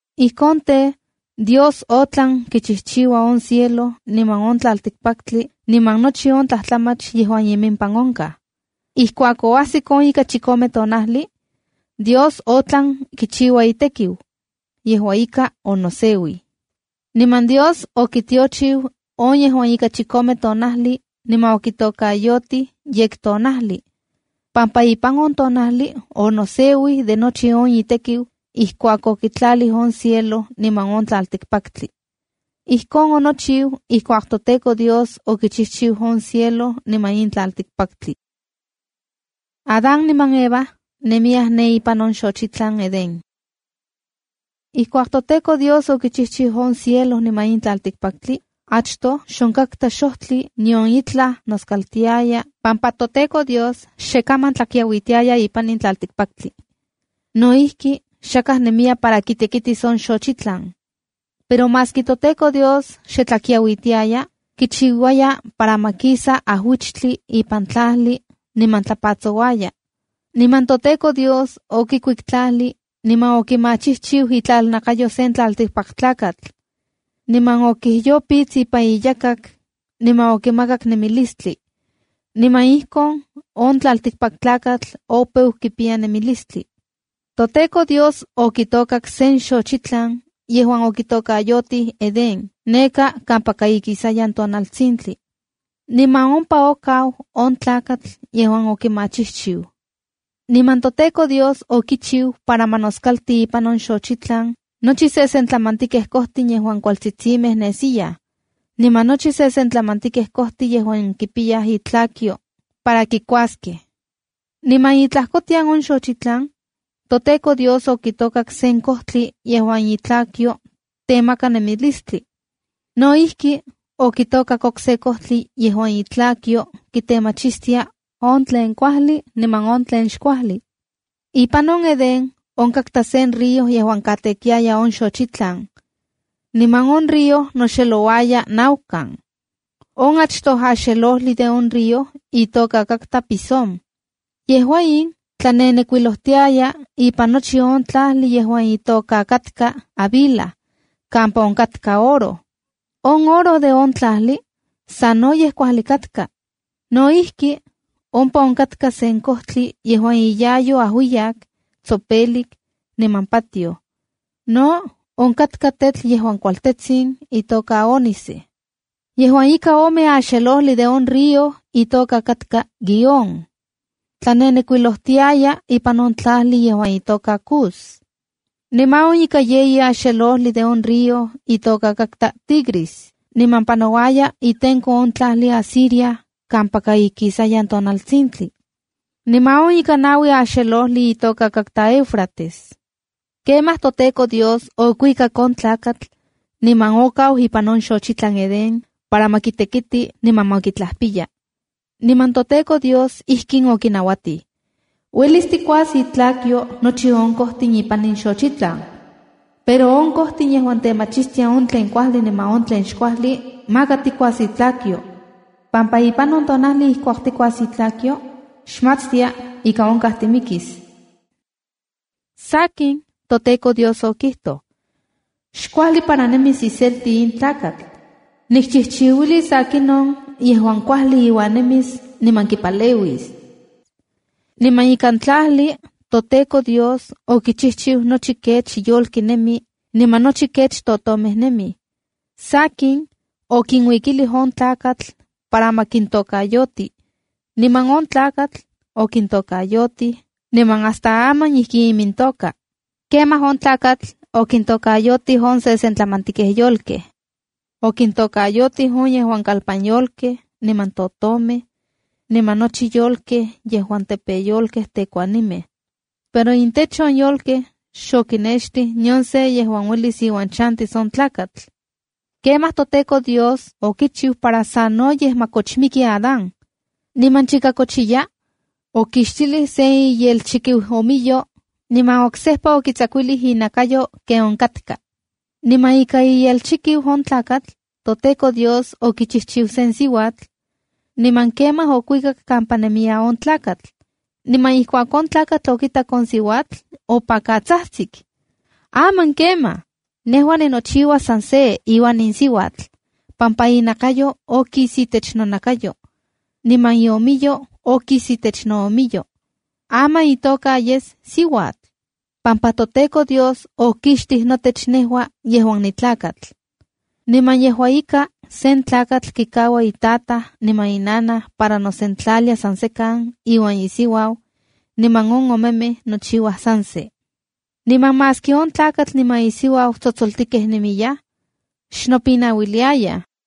Ijkon tej, Dios otlan kichijchiua on cielo niman on tlaltikpaktli niman nochi on tlajtlamach yejuan imimpan onkaj. Ijkuak oajsik on ika chikome tonajli, Dios otlan kichiua itekiu. Yejua ika onoseuij. Niman Dios okitiochiu on yejuan ika chikome tonajli niman okitokayotij “yektonajli” pampa ipan on tonajli onoseuij de nochi on itekiu ijkuak okitlalij on cielo niman on tlaltikpaktli. Ijkon onochiu ijkuak toTEKO Dios okichijchiu on cielo niman in tlaltikpaktli. Adán niman Eva nemiyaj ne ipan on xochitlan Edén Ijkuak toTEKO Dios okichijchiu on cielo niman in tlaltikpaktli, achtoj xonkatka xojtli nion itlaj noskaltiaya pampa toTEKO Dios xe kaman tlakiauitiaya ipan in tlaltikpaktli. No ijki, xakaj nemiya para kitekitis on xochitlan. Pero maski toTEKO Dios xe tla kiauitiaya, kichiuaya para ma kisa ajuichtli ipan tlajli niman tlapatsouaya. Niman toTEKO Dios okikuik tlajli niman okimachijchiu itlalnakayo sen tlaltikpaktlakatl. Niman okijyopits ipan iyakak, niman okimakak nemilistli. Niman ijkon on tlaltikpaktlakatl opeu kipiya nemilistli. ToTEKO Dios okitokak sen xochitlan yejuan okitokayotij Edén neka kampaka ikisayan tonaltsintli. Niman ompa okau on tlakatl yejuan okimachijchiu. Niman toTEKO Dios okichiu para ma noskalti ipan on xochitlan nochi sesentlamantikej kojtin yejuan kualtsitsimej nesiyaj, niman nochi sesentlamantikej kojtin yejuan kipiyaj intlakyo para kikuaskej. Niman itlajkotian on xochitlan, toTEKO Dios okitokak sen kojtli yejuan itlakyo temaka nemilistli. No ijki, okitokak okse kojtli yejuan itlakyo kitemachistia on tlen kuajli niman tlen xkuajli. Ipan on Edén onkatka sen río yejuan katekiaya on xochitlan. Niman on río noxexelouaya naukan. On achtoj axelojli de on río itoka katka Pisón. Yejua in tlanenekuilojtiaya ipan nochi on tlajli yejuan itoka katka Havila kampa onkatka oro. On oro de on tlajli sanoyej kuajli katka. No ijki, ompa onkatka sen kojtli yejuan iyayo ajuiyak, tsopelik, niman patioj. No onkatka tetl yejuan kualtsin, itoka ónice. Yejuan ika ome axelojli de on río itoka katka Guihón. Tlanenekuilojtiaya ipan on tlajli yejuan itoka Cus. Niman on ika yeyi axelojli de on río itoka katka Tigris, niman panouaya itenko on tlajli Asiria kampaka ikisayan tonatsintli. Niman on ika naui axelojli itoka katka Éufrates. Kemaj toTEKO Dios okuikak on tlakatl, niman okau ipan on xochitlan Edén para ma kitekiti niman ma kitlajpiya. Niman toTEKO Dios ijkin okinauatij: “Uelis tikuas itlakyo nochi on kojtin ipan in xochitlan, pero on kojtli yejuan temachistia on tlen kuajli niman on tlen xkuajli, maka tikuas itlakyo, pampa ipan on tonajli ijkuak tikuas itlakyo, xmatstia ika ika onkaj timikis.” Sakin, toTEKO Dios okijtoj: “Xkuajli para nemis iselti in tlakatl. Nikchijchiuilis akinon yejuan kuajli iuan nemis niman kipaleuis.” Niman ikan tlajli toTEKO Dios okichijchiu nochi kech yolki nemi, niman nochi kech totomej nemij. Sakin, okinuikilij on tlakatl para ma kintokayoti. Niman on tlakatl okintokayotij, niman hasta aman ijki imintoka. Kemaj on tlakatl okintokayotij on sesentlamantikej yolkej. Okintokayotij on yejuan kalpanyolkej, niman totomej, niman nochi yolkej yejuan tepeyolkej tekuanimej. Pero intech on yolkej xokinextij nion se yejuan uelis iuan chantis on tlakatl. Kemaj toTEKO Dios okichiu para sanoyej ma kochmiki Adán. Niman chika kochiya, okixtilij se iyelchikiuomiyo, niman oksejpa okitsakuilij inakayo ken onkatka. Niman ika iyelchikiu on tlakatl, toTEKO Dios okichijchiu sen siuatl. Niman kemaj okuikak kampa nemiya on tlakatl. Niman ijkuak on tlakatl okitak on siuatl, opakatsajtsik: “¡Aman kemaj! Nejua ninochiua san se iuan in siuatl, pampa inakayo okis itech nonakayo, niman iomiyo okis itech noomiyo. Aman itoka yes ‘siuatl’, pampa toTEKO Dios okixtij notech nejua yejuan nitlakatl.” Niman yejua ika, sen tlakatl kikaua itataj niman inanaj para nosentlalia san sekan iuan isiuau, niman on omemej nochiuaj san se. Niman maski on tlakatl niman isiuau tsotsoltikej nemiyaj, xnopinauiliayaj.